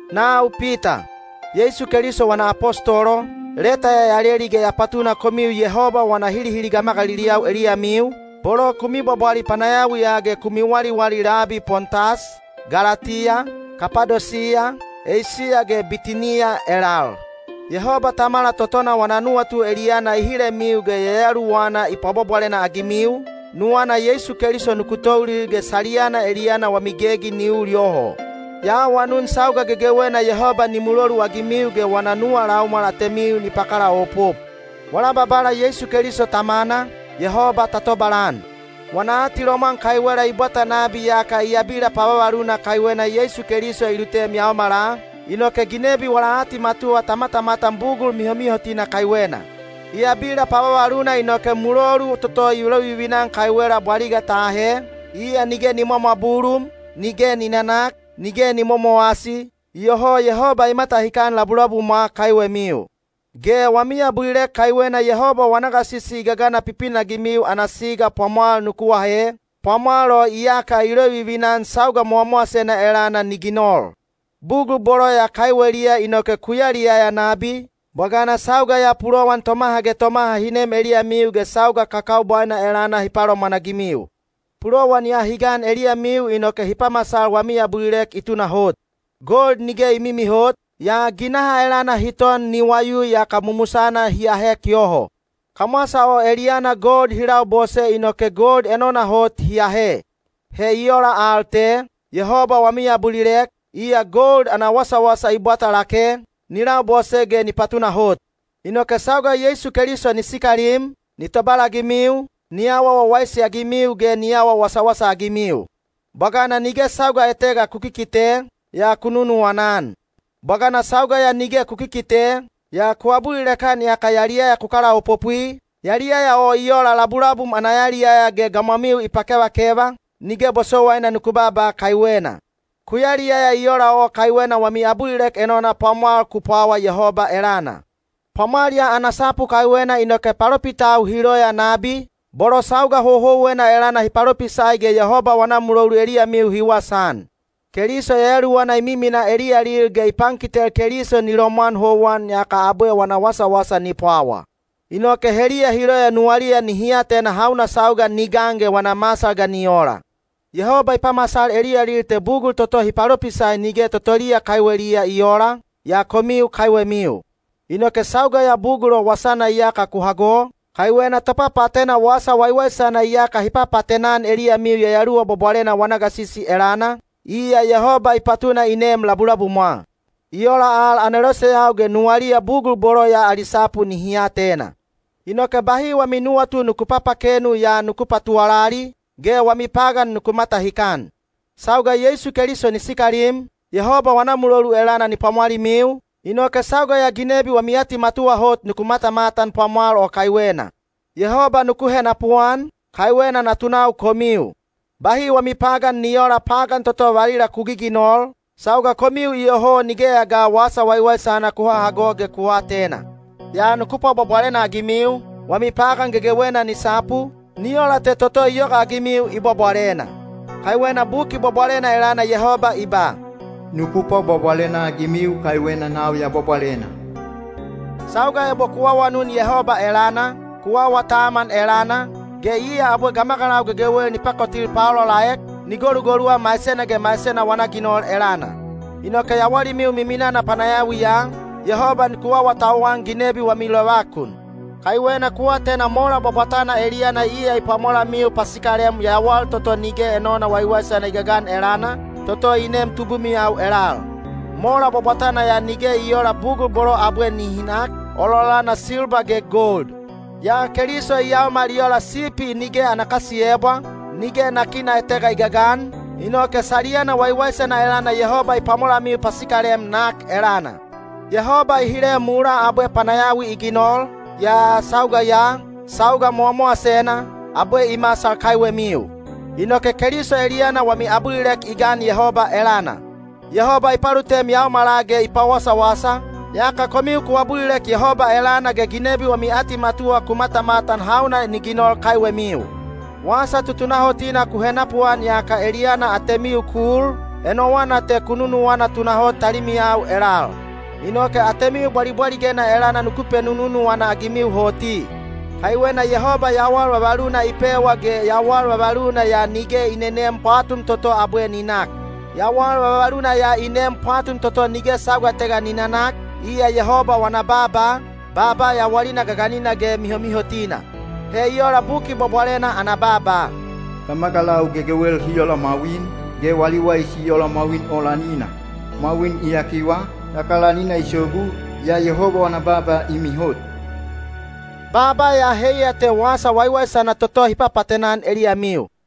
Nau Pita, Yeisu Keliso wana apostolo, leta ya ya leli ge ya patuna komiu Yehoba wana hilihili gamagaliliyau eliyamiu, bolo ku mibwabwali panayawiya ge ku miwaliwali labi Pontas, Galatiya, Kapadosiya, Eisiya ge Bitiniya elal. Yehoba Tamala totona wana nuwatu eliyana i hilemiu ge Yayaluwana i pwabwabwalena-agimiu, nuwana Yeisu Keliso nuku toulil ge saliyana eliyana wami gegi ni ul yoho. Ya awanun sauga gegewena Yehoba ni muloluagimiu ge wana nuwa laumwal atemiu ni pakalaopop. Wala Babala Yeisu Keliso Tamana, Yehoba ta tobalan! Wana atilomwan kaiwela i bwata nabi yaka i abila pavavaluna kaiwena Yeisu Keliso i lutem yaomala, inoke ginebi wala atimatuwa ta matamatan bugul mihomihotina kaiwena. I abila pavavaluna inoke mulolu toto i lovivina-an kaiwela bwaliga ta ahe, iya nige ni mwamwabulum, nige ni nanak, nige ni momowasi, iyoho Yehoba i matahikan labulabumwa kaiwemiu. Ge wami abulilek kaiwena Yehoba wana gasisi i gagana pipinagimiu ana siga pwamwal nuku ahe, pwamwal o iyaka i lovivina-an sauga mowamowasena elana ni ginol. Bugul bolo ya kaiweliya inoke ku yaliyaya nabi, bwagana sauga ya pulowan tomaha ge tomaha hi nem eliyamiu ge sauga kakaubwaina elana hi palomwanagimiu. Pulowan ya hi gan eliyamiu inoke hi pamasal wami abulilek i tunahot. Gold nige i mimihot, yaa ginaha elana hi ton ni wayui yaka mumusana hi ahek yoho. Kamwasa o eliyana gold hi labose inoke gold enona hot hi ahe. He i ola al te, Yehoba wami abulilek, iya gold ana wasawasa i bwata lake, ni labose ge ni patunahot. Inoke sauga Yeisu Keliso ni sikalim, ni tobalagimiu, ni awa wawaisi-agimiu ge ni awa wasawasa-agimiu. Bwagana nige sauga etega ku kikite, yaa ku nunuwana-an. Bwagana sauga ya nige ku kikite, yaa ku abulilek-an yaka yaliyaya ku kalaopopwi, yaliyaya o i ola labulabum ana yaliyaya ge gamwamiu i pakevakeva, nige bosowaina nuku baaba kaiwena. Ku yaliyaya i ola o kaiwena wami abulilek enona pwamwal ku pwawa Yehoba elana. Pwamwal ya ana sapu kaiwena inoke palopitau hi loya nabi, bolo sauga houhouwena elana hi palopisai ge Yehoba wana mulolu eliyamiu hi wasaan. Keliso Yayaluwana i miminaa eliyalil ge i pankitel Keliso ni lomwan houwan yaka abwe wana wasawasa ni pwawa. Inoke heliya hi loya nuwaliya nihi atena hauna sauga ni gan ge wana masal ga ni ola. Yehoba i pamasal eliyalil te bugul toto hi palopisai nige totoliya kaiweliya i oola, yaa komiu kaiwemiu. Inoke sauga ya bugul o wasana iyaka ku hago, kaiwena topapaatena Wasa Waiwaisana iyaka hi papaatena-an eliyamiu Yayaluwa Bwabwalena wana gasisi elana, iya Yehoba i patuna i neem labulabumwa. I ola al aneloseyau ge nuwaliya bugul bolo ya ali sapu nihi atena. Inoke bahi wami nuwatu nuku papakenu yaa nuku patuwalali, ge wami pagan nuku matahikan. Sauga Yeisu Keliso ni sikalim, Yehoba wana mulolu elana ni pwamwalimiu, inoke sauga ya ginebi wami atimatuwa hot nuku matamatan pwamwal o kaiwena. Yehoba nuku henapuan, kaiwena natunau komiu. Bahi wami pagan ni oola pagan toto valila ku giginol, sauga komiu iyoho nigeya ga Wasa Waiwaisana ku hahago ge ku aatena. Yaa nuku pwabwabwalena-agimiu, wami pagan gegewena ni sapu, ni ola te toto i yogaagimiu i bwabwalena. Kaiwena Buki Bwabwalena elana Yehoba i ba, “Nuku pwabwabwalena-agimiu kaiwena nau ya bwabwalena.” Sauga ebo ku awanun Yehoba elana, ku awa taman elana, ge iya abwe gamagalau gegewel ni pakotil paolaolaek, ni golugoluwa maisena ge maisena wana ginol elana. Inoke yawalimiu miminana panayawiya, Yehoba nuku awatauwan ginebi ge wami lovakun. Kaiwena ku atena mola bwabwatana eliyana iya i pwamolamiu pasikalem yawal toto nige enona waiwaisana i gagan elana, toto i neem tubumiyau elal. Mola bwabwatana ya nige i oola bugul bolo abwe nihi nak, ololana silba ge gold. Yaa Keliso i yaomal i ola sipi nige ana kasiyebwa, nige nakina etega i gagan, inoke saliyana waiwaisana elana Yehoba i pwamolamiu pasikalem nak elana. Yehoba i hile mulaa abwe panayawi i ginol, yaa sauga ya, sauga mowamowasena, abwe i masal kaiwemiu. Inoke Keliso eliyana wami abulilek i gan Yehoba elana. Yehoba i palutem yaomala ge i pawasawasa, yaka komiu ku abulilek Yehoba elana ge ginebi wami atimatuwa ku matamatan hauna ni ginol kaiwemiu. Wasa tutunahotina ku henapuan yaka eliyana atemiu ku ul, enowana te ku nunuwana tunahot talimiyau elal. Inoke atemiu bwalibwaligena elana nuku penununuwana-agimiu hoti. Kaiwena Yehoba yawal vavaluna i pewa ge yawal vavaluna ya nige i neneem pwatum toto abwe ni nak. Yawal vavaluna ya i neem pwatum toto nige sauga etega ni nanak, iya Yehoba wana baaba, baaba yawalina gaganina ge mihomihotina. He i ola Buki Bwabwalena ana baaba: Gamagalau gegewel hi ola mwawin, ge wali waisi i ola mwawin o lanina. Mwawin i yakiwa, yaka lanina i sogu, yaa Yehoba wana baaba i mihot. Baaba ya heiya te Wasa Waiwaisana toto hi papaatena-an eliyamiu.